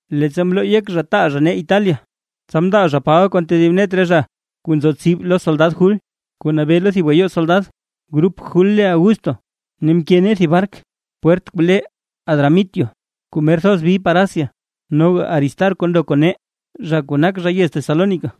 Leettsa mloo yek zha taal zha nee Italia, tsa mndaa zha Paba kon tedib net re zha kuu nzo tsib lo soldad Jul, kuu nabee lo thib gayoo soldad, grup Jul le Augusto. Ne mke nee thib bark pwert kuu le Adramitio kuu mer thoz bi par Asia. Noga Aristarco ndo kon nee, zha kuu nak zha yez Tesalónica,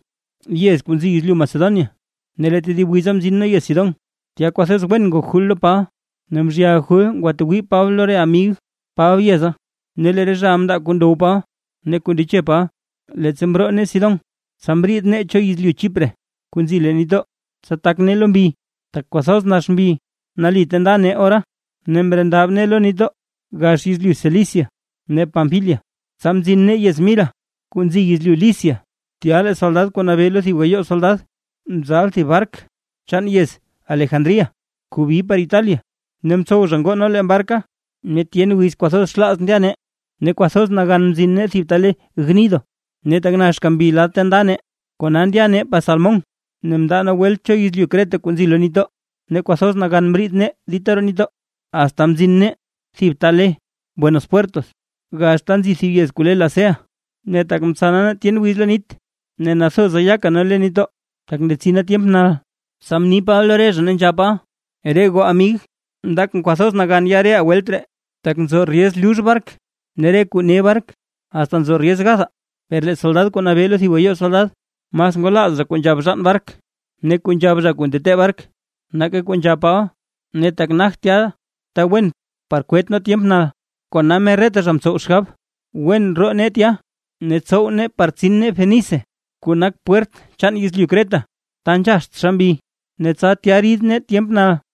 yez kuu nzi yezlyu Macedonia. Ne lee tedib wiza mzin nee yez Sidón, tya kwathoz wen ngok Jul lo Paba ne mzhyal Jul ngwatwii Paba lo re amig Paba yeza, ne lee re zhaʼa mndaa kuu ndow Paba ne kuu ndeche Paba. Leettsa mroo nee Sidón, tsa mriid nee cho yezlyu Chipre kuu nzi leen nitdoo, tsa tak nee lo mbi, tak kwathoz nax mbi nali ta nda nee ora. Ne mrendab nee lo nitdoo gax yezlyu Cilicia ne Panfilia, tsa mzin nee yez Mira kuu nzi yezlyu Licia. Tya lee soldad kuu nabee lo thib gayoo soldad mzal thib bark chaan yez Alejandría kuu bi par Italia, ne mtsow zha ngoo nee leen barka. Ne tyen wiz kwathoz xlaaz ndya nee, ne kwathoz nagan mzin nee thib ta le Gnido. Ne tak naxka mbi lad ta nda nee, kona ndya nee par Salmón, ne mndaa nee welt cho yezlyu Creta kuu nzi leen nitdoo. Ne kwathoz nagan mriid nee dita roo nitdoo, asta mzin nee thib ta le Buenos Puertos, gax ta nzi thib yez kuu le Lasea. Ne tak mtsana nee tyen wiz lo nit, ne nathoza yaka nee lo nitdoo, tak ndetsina tyemp nal, tsa mni Paba lo re zha, ne nzhab Paba: ―Re goo amig, ndakʼn kwathoz nagan ya reʼaa welt ree, tak nzo ryez lux bark ne re kuu ne bark, asta nzo ryez gathaa. Per lee soldad kuu nabee lo thib gayoo soldad, mas ngwalaaz zha kuu nzhab bzhaan bark ne kuu nzhab zha kuu ntetee bark, nake kuu nzhab Paba. Ne tak nagt tya ta wen par kwet nee tyemp nal, kona mer reta zha mtsow xgab wen roo nee tya, ne tsow nee par tsin nee Fenice, kuu nak pwert chaan yezlyu Creta, ta nzhaxt xa mbi ne tsa tya rid nee tyemp nal.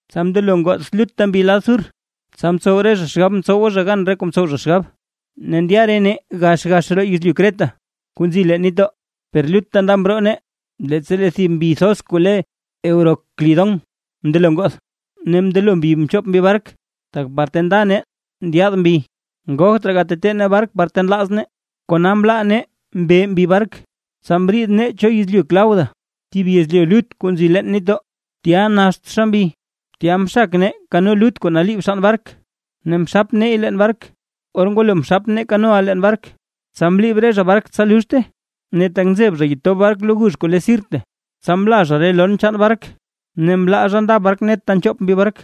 Tsa mndelo ngoth lutta mbi lad sur, tsa mtsow re zha xgab mtsowa zha gan kuu mtsow zha xgab, ne ndya re nee gax gax roo yezlyu Creta kuu nzi leen nitdoo. Per lutta nda mroo nee, leettsa lee thib mbi thoz kuu le Euroclidón mndelo ngoth, ne mndelo mbi mchop mbi bark, tak par ta nda nee ndyaad mbi, ngogt raa gatetee nee bark par ta nlaaz nee, kona mlaa nee mbe mbi bark. Tsa mriid nee cho yezlyu Clauda, thib yezlyu lut kuu nzi leen nitdoo, tya naxtxa mbi, tya mxak nee kano lut kuu naliib xann bark ne mxap neey leen bark. Or ngwalo mxap nee kanoʼa leen bark, tsa mliib re zha bark tsa luxte. Ne tak nzeb zha yetob bark lo gux kuu le Sirte, tsa mla zha re lon chaan bark, ne mlaa zha nda bark net ta nchoop mbi bark.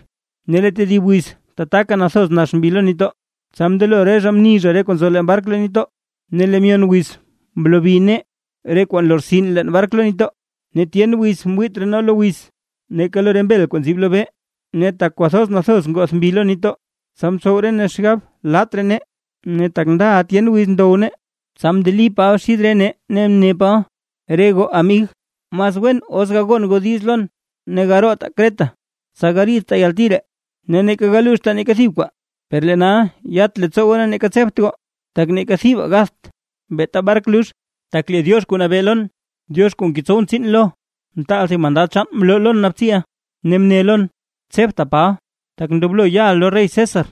Ne lee tedib wiz tataka nathoz nax mbi lo nitdoo, tsa mndelo re zha mni zha re kuu nzo leen bark leen nitdoo, Ne lee myon wiz mlobi nee re kwaa nlortsin leen bark leen nitdoo. Ne tyen wiz mwiit raa nee lo wiz neeka lo re mbel kuu nzib lobee, ne tak kwathoz nathoz ngoth mbi lo nitdoo, tsa mtsow re nee xgab laat raa nee. Ne tak ndaʼa tyen wiz ndow nee, tsa mndeli Paba xid re nee ne mne Paba: ―Re goo amig, mas wen os gagon goo diiz lon ne garootaa Creta, tsa gariidtaa yalti ree, ne neeka galuuxtaa neeka thib kwaa. Per lee nal yat leettsoo goo ne neeka tsebt goo, tak neeka thibaa gatht, beeta bark lux. Tak lee Diox kuu nabee lon, Diox kuu ngetsowʼn tsiin lo, mtaal thib mandad chaan mloo lon naabtsiʼa, ne, mne lon: “Tsebta Paba, tak ndoblo yaʼa lo rey César,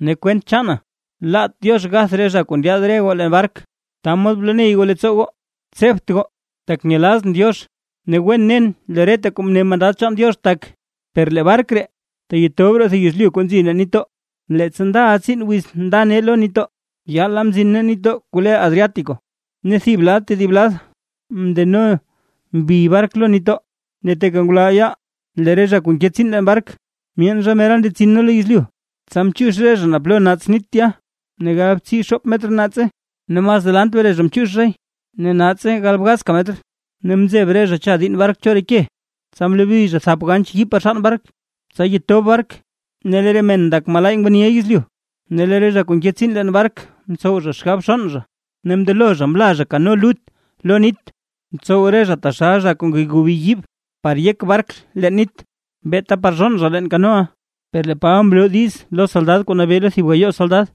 ne kwent chaana laat Diox gath re zha kuu ndyaad re goo leen bark”. Ta mod bloney goo leettsoo goo, tsebt goo, tak nyelaazʼn Diox, ne wen nen lee reta kuu mne mandad chaan Diox lon tak. Per lee bark ree teyetob roo thib yezlyu kuu nzi leen nitdoo. Leettsa ndaʼa tsiin wiz nda nee lo nitdoo, yaala mzin nee nitdoo kuu le Adriático, ne thib lad tedib lad mndeno mbi bark lo nitdoo, ne teeka ngulal yaal lee re zha kuu nke tsiin leen bark myeen zha mera ndetsin nee lo yezlyu. Tsa mchiix re zha naa plo naats nit tya, ne galbtsii xoop metr naatse. Ne mas delant mre zha mchiix zhay, ne naatslay galbgazka metr. Ne mzeb re zha cha diinn bark cho re ke, tsa mlobi zha thap ganch yiib par xann bark, tsa yetob bark. Ne lee re men ndak: “Malaay ngwaniʼa yezlyu”. Ne lee re zha kuu nke tsiin leen bark mtsow zha xgab zhonn zha. Ne mndelo zha mla zha kano lut lo nit, mtsow re zha taxal zha kuu ngegobi yiib par yek bark leen nit, beeta par zhonn zha leen kanoʼa. Per lee Paba mloo diiz lo soldad kuu nabee lo thib gayoo soldad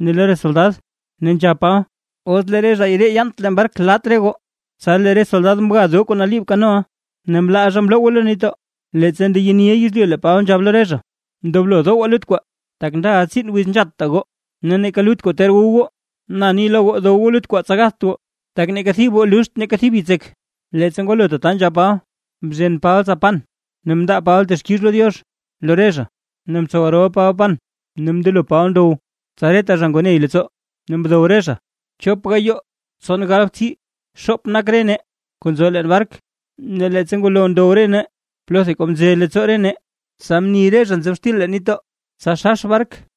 ne lo re soldad, ne nzhab Paba: ―Os lee re zha ree yaant leen bark, laat re goo. Tsa lee re soldad mga doo kuu naliib kanoʼa ne mlaa zha mlowgwe lo nitdoo. Leettsa ndeyeniʼa yezlyu, lee Paba nzhab lo re zha: ―Ndoblo dowaa lut kwaa, tak ndaʼa tsiin wiz nzhatta goo ne neeka lut kwaa ter wu goo. Na ni lo goo dow goo lut kwaa, tsa gatht goo, tak neeka thib goo luxt neeka thib yitsek. Leettsa ngwalo tata nzhab Paba, mzhen Paba tsa pan ne mndaa Paba texkix lo Diox lo re zha, ne mtsow rol Paba pan ne mndelo Paba ndow. Tsa reta zha ngoo ney leettsoo ne mdow re zha. Chop gayoo tson galbtsii xoop nak re nee kuu nzo leen bark. Ne leettsa ngwalo ndow re nee plotha kuu mze leettsoo nee, tsa mni re zha nzob xtil leen nitdoo, tsa xax bark.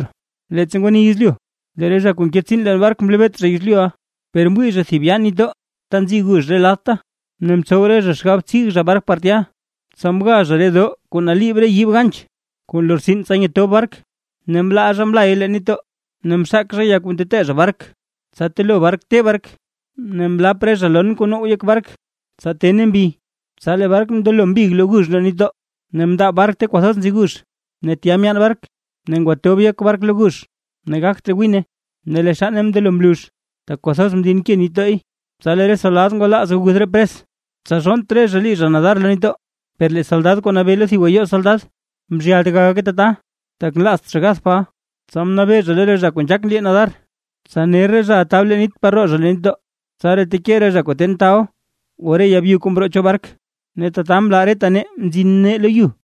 Leettsa ngwani yezlyu, lee re zha kuu nke tsiin leen bark mlebeet zha yezlyuʼa, per mwii zha thib yaa nitdooʼa ta nzi gux re ladta, ne mtsow re zha xgab tsig zha bark par tya. Tsa mga zha re doo kuu naliib re yiib ganch kuu nlortsin tsa yetob bark, ne mlaa zha mlay leen nitdoo, ne mxak zha ya kuu ntetee zha bark, tsa telo bark te bark. Ne mlap re zha lon kuu now yek bark, tsa tene mbi, tsa lee bark mndelo mbig lo gux roo nitdoo. Ne mndaab bark ta kwathoz nzi gux ne tya myaan bark. Ne ngwatob yek bark lo gux ne gagt raa wine, ne lee xanne mndelo mlux, tak kwathoz mdinke nitdooy. Tsa lee re soldad ngwalaaz aguth re pres, tsa zhonnt re zha lii zha nadar lo nitdoo. Per lee soldad kuu nabee lo thib gayoo soldad mzhyalt gagake tata, tak nlaazt zha gath Paba, tsa mnabee zha lo re zha kuu nzhaak nlii nadar, tsa ner re zhaʼa tab lo nit par roo zha leen nitdoo. Tsaraa teke re zha kuu ten tabl o re ya byu kuu mroo cho bark. Ne tata mla reta nee mzin nee lo yu.